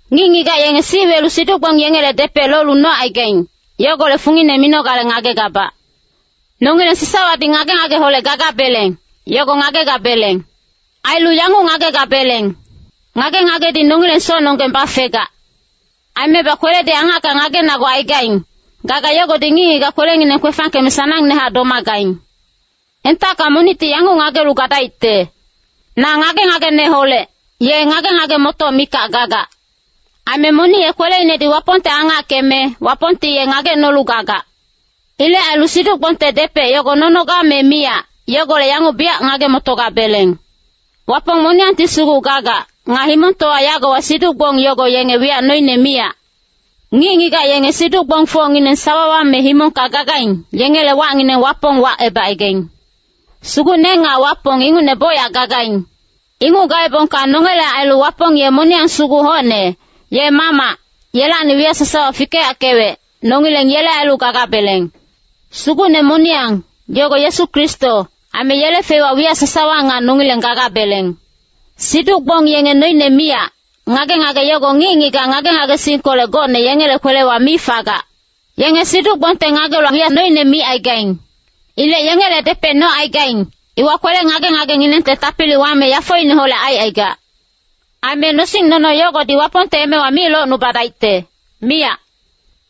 Ngic-ngigac yenge sic welu siduc-gbong yengele depec lolu nocaigaing, yogolec fungine minogale ngagegabac. Nongileng sasawadi ngage-ngageholec gagabeleng, yogo ngagegabeleng. Ailu yanguc ngagegabeleng, “Ngage-ngagedi nongileng socnonggeng bafegac.” Aimebac kweledi angacka ngagenagucaigaing, gaga yogodi ngic-ngigac kwelenginang kwefangkeme sanangnehac domagaing. Entacka monicti yanguc ngagelu gadaicte, “Na ngage-ngageneholec,” ye ngage-ngage-motoc mikac gagac. Aime monic ye kweleinedi Wapongte angackeme, Wapongti ye ngagecnolu gagac. Ilec ailu siduc-gbongte depec yogo nonoga me miyac, yogolec yanguc biyac ngage-motogabeleng. Wapong moniyangti sugu gagac. Nga himongtowa yagowa siduc-gbong yogo yenge wiyac noine miyac. Ngic-ngigac yenge siduc-gbongfocngineng sawawa me himongka gagaing, yengele wacngineng wapong wacebacaigaing. Sugucne nga wapong ingucne bocyac gagaing. Inguc gaebongka nongele ailu Wapong ye moniyang sugu hocne, ye Mamac, yelacni wiyac sasawa fikeyackewec, nongileng yele ailu gagabeleng. Sugucne moniyang, yogo Yesu Kristo, aime yele feiwa wiyac sasawa nga nongileng gagabeleng. Siduc-gbong yenge noine miyac, ngage-ngage yogo ngic-ngigac ngage-ngagesingkolec gocne yengele kwelewa mi fagac. Yenge siduc-gbongte ngagelu wiyac noine micaigaing. Ilec yengele depec nocaigaing, iwa kwele-ngage-ngagenginengte tapili wame yafoineholec aicaigac. Aime nosing-nono yogodi Wapongte emewa mi locnubadaicte, miyac.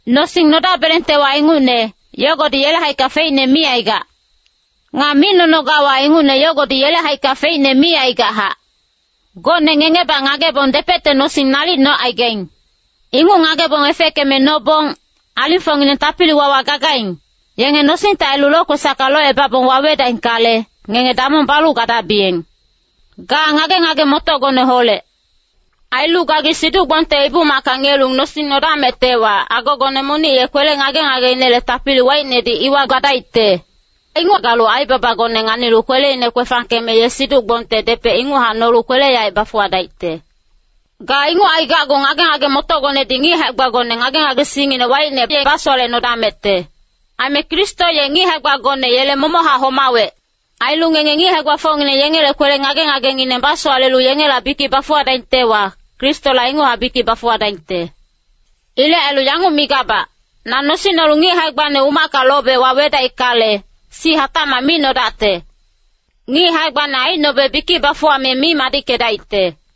Nosing nodabelengtewa, ingucne, yogodi yele haicka feicne mi aigac. Nga mi nonogawa ingucne yogodi yele haicka feicne mi aigachac. Gocne ngengebac ngagebong depecte nosing nalic nocaigaing. Inguc ngagebong efeckeme nobong, alingfocngineng tapili-wawa gagaing, yenge nosingte ailu lokwesacka locebabong wawedaingkale, ngenge damong balu gadabiyeng. Ga ngage-ngage-motocgoneholec. Ailu gagi siduc-gbongte ibu-macka ngiyelu nosing nodamectewa, agogone monic ye kwele ngage-ngageinele tapili waicnedi iwa gadaicte. Inguc galu aibabagone nganilu kweleine kwefangkeme ye siduc-gbongte depec inguchac nolu kwele-yaec bafuwadaicte. Ga inguc aigacgu ngage-ngage-motocgonedi ngic hae-gbagone ngage-ngagesingngine waicne ye basowalecnodamecte. Aime Kristo ye ngic hae-gbagone yele momochac homawec. Ailu ngenge ngic hae-gbafocngineng yengele kwele ngage-ngagengineng basowalelu yengela bikic bafuwadaingtewa, Kristola inguchac bikic bafuwadaingte. Ilec ailu yanguc migabac, na nosing nolu ngic hae-gbane umacka lobe wawedaickale, sic hatacmac mi nodacte. Ngic hae-gbane aicnobe bikic bafuwame mi madickedaicte.